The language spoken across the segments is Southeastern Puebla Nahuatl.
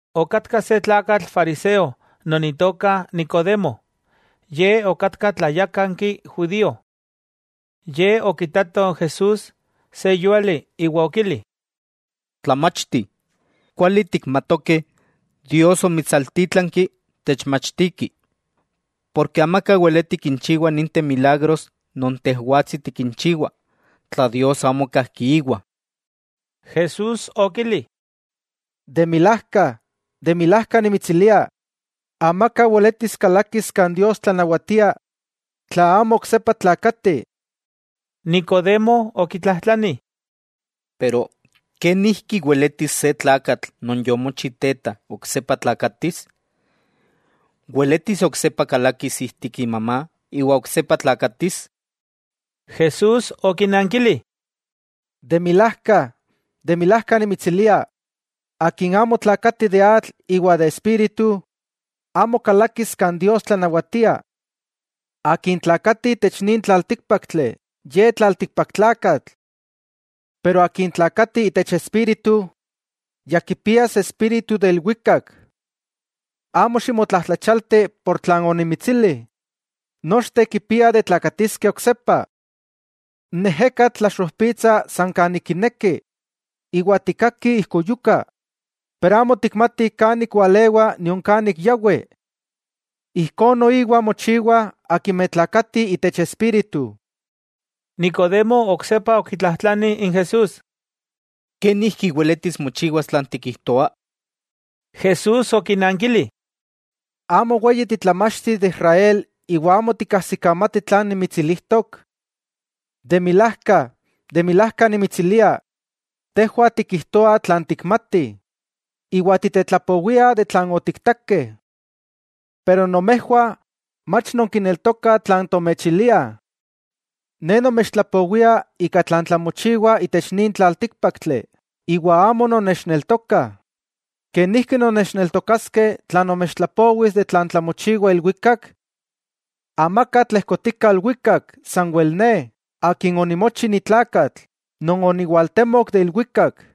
Okatka se tlakatl fariseo non itoka Nicodemo, ye okatka tlayakanki judío. Ye okitato n Jesús se yúali, iwa okili: —Tlamachti, kuali tikmatokeh Dios omitsaltítlanki techmachtiki, porke amaka weleti kinchiwa ninteh milagros non Tejwatsi tikinchiwa, tla Dios amo kajki iwa. Jesús okili: —De milajka, de milajka nimitsilia, amaka weletis kalakis kan Dios tlanawatia, tla amo oksepa tlakati. Nicodemo okitlajtlani: —¿Kenijki weletis se tlakatl non yomochi teta oksepa tlakatis? ¿Weletis oksepa kalakis ijtik imamá iwa oksepa tlakatis? Jesús okinankili: —De milajka, de milajka nimitsilia, akin amo tlakati de atl iwa de Espíritu, amo kalakis kan Dios tlanawatia. Akin tlakati itech nin tlaltíkpaktli, ye tlaltikpaktlakatl. Pero akin tlakati itech Espíritu, ya kipias espíritu de ilwikak. Amo ximotlajtlachialti por tlan onimitsili: “Nochteh kipiah de tlakatiskeh oksepa.” N ejekatl tlaxojpitsa san kan ik kineki, iwa tikkaki ijkuyuka, pero amo tikmati kan ik walewa nion kan ik yawi. Ijkó noiwa mochiwah akimeh tlakatih itech Espíritu. Nicodemo oksepa okitlajtlani n Jesús: —¿Kenijki weletis mochiwas tlan tikijtoa? Jesús okinankili: —¿Amo weyi titlamachti de Israel iwa amo tikkasikamati tlan nimitsilijtok? De milajka, de milajka nimitsilia, tejwah tikijtoah tlan tikmatih, iwa titetlapowiah de tlan otiktakeh. Pero nomejwah mach nonkineltokah tlan tomechiliah. Ne nomechtlapowia ika tlan tlamochiwa itech nin tlaltíkpaktli, iwa amo nonnechneltokah, ¿kenijki nonnechneltokaskeh tla nomechtlapowis de tlan tlamochiwa ilwikak? 'Amaka tlejkotika ilwikak, sanwel Ne, Akin onimochi ni tlakatl, non oniwaltemok de ilwikak.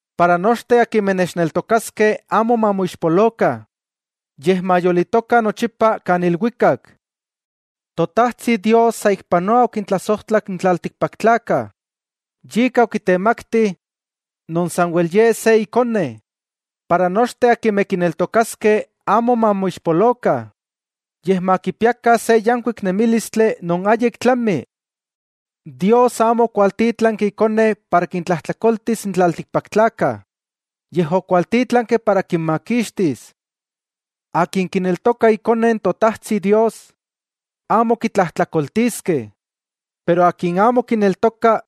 para nochteh akimeh nechneltokaskeh amo mamoixpolokah, yej mayolitokah nochipa kan ilwikak. 'Totajtsi Dios saikpanoa okintlasojtlak n tlaltikpaktlakah, yika okitemakti non sanwel Ye se Ikone, para nochteh akimeh kineltokaskeh amo mamoixpolokah, yej makipiakah se yankuik nemílistli non ayik tlami. Dios amo okwaltítlanki Ikone para kintlajtlakoltis n tlaltikpaktlakah, yej okwaltítlanki para kinmakixtis. 'Akin kineltoka Ikone n Totajtsi Dios, amo kitlajtlakoltiskeh. Pero akin amo kineltoka,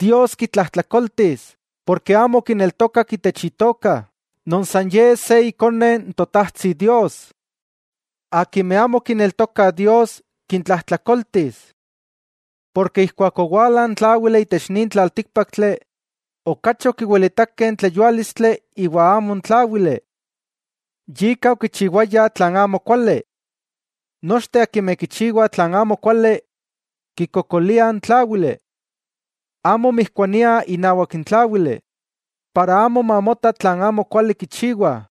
Dios kitlajtlakoltis porke amo okineltokak itech Itoka non san Ye se Ikone n Totajtsi Dios. Akimeh amo kineltokah Dios, kintlajtlakoltis. Porke ijkuak owala n Tláwili itech nin tlaltíkpaktli, okachi okiwilitakeh n tleyuálistli iwa amo n tláwili. Yika okichiwayah tlan amokuali. Nochteh akimeh kichiwah tlan amokuali, kikokoliah n Tláwili. Amo mijkuaniah inawak n Tláwili, para amo mamota tlan amokuali kichiwah.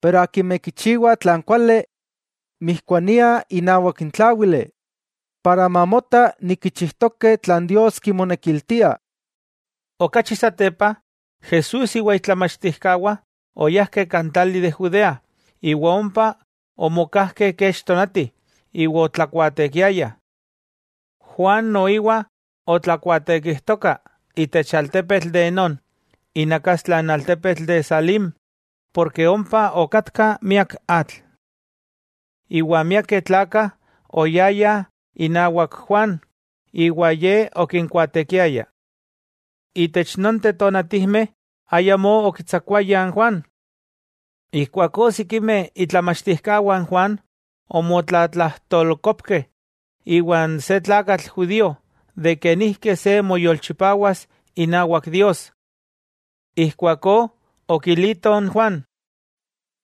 Keman akimeh kichiwah tlan kuali, mijkuaniah inawak n Tláwili, ijkó mamota kichijtokeh tlan Dios kimonekiltia. Okachi satepa, Jesús iwa itlamachtijkawah oyajkeh kan tlali de Judea, iwa ompa omokajkeh kech tonati, iwa otlakuaatekiayah. Juan noiwa otlakuaatekijtoka itech altepetl de Enón, inakastla n altepetl de Salim, porke ompa okatka miak atl. Iwa miakeh tlakah oyayah inawak Juan iwa Ye okinkuaatekiaya. Itech nonteh tonatijmeh ayamó okitsakuayah n Juan. Ijkuakó sikimeh itlamachtijkawah n Juan omotlatlajtolkopkeh iwan se tlakatl judío de kenijki se moyolchipawas inawak Dios. Ijkuakó okilitoh n Juan: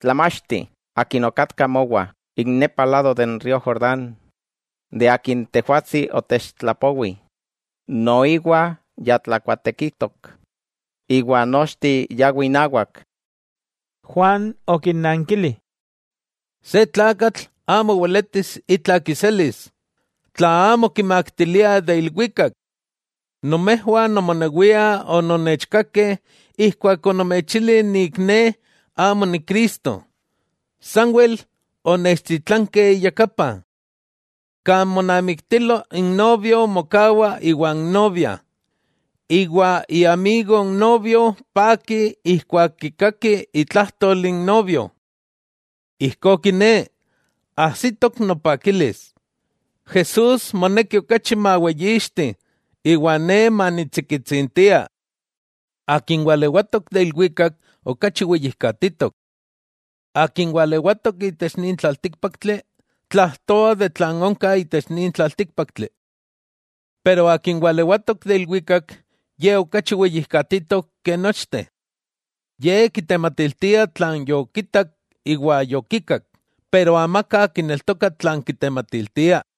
—Tlamachti, akin okatka mowa ik nepa lado de n río Jordán, de akin tejwatsi otechtlapowi, noiwa ya tlakuaatekijtok, iwa nochteh yawih inawak. Juan okinnankili: —Se tlakatl amo weletis itla kiselis, tla amo kimaktilia de ilwikak. Nomejwah nomonewiah ononnechkakeh ijkuak onomechili nik ne amo ni Cristo, sanwel onechtitlanke iyakapa. Kan monamiktilo, n novio mokawa iwan novia, iwa iamigo n novio paki ijkuak kikaki itlajtol n novio. Ijkó kiné, ajsitok nopakilis. Jesús moneki okachi maweyixti, iwa ne manitsikitsintia. 'Akin walewatok de ilwikak okachi weyijkatitok. Akin walewatok itech nin tlaltíkpaktli, tlajtoa de tlan onka itech nin tlaltíkpaktli. Pero Akin walewatok de ilwikak Ye okachi weyijkatitok ke nochteh. Ye kitematiltia tlan yokitak iwa yokikak, pero amaka kineltoka tlan kitematiltia.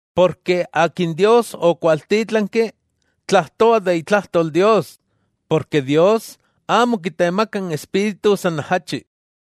Porke Akin Dios okwaltítlanki, tlajtoa de itlajtol Dios, porke Dios amo kitemaka n Espíritu san ajachi.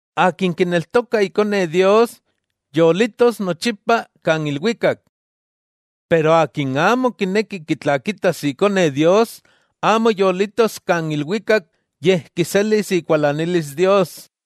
Akin kineltoka Ikone Dios, yolitos nochipa kan ilwikak. Pero akin amo kineki kitlakitas Ikone Dios, amo yolitos kan ilwikak yej kiselis ikualanilis Dios.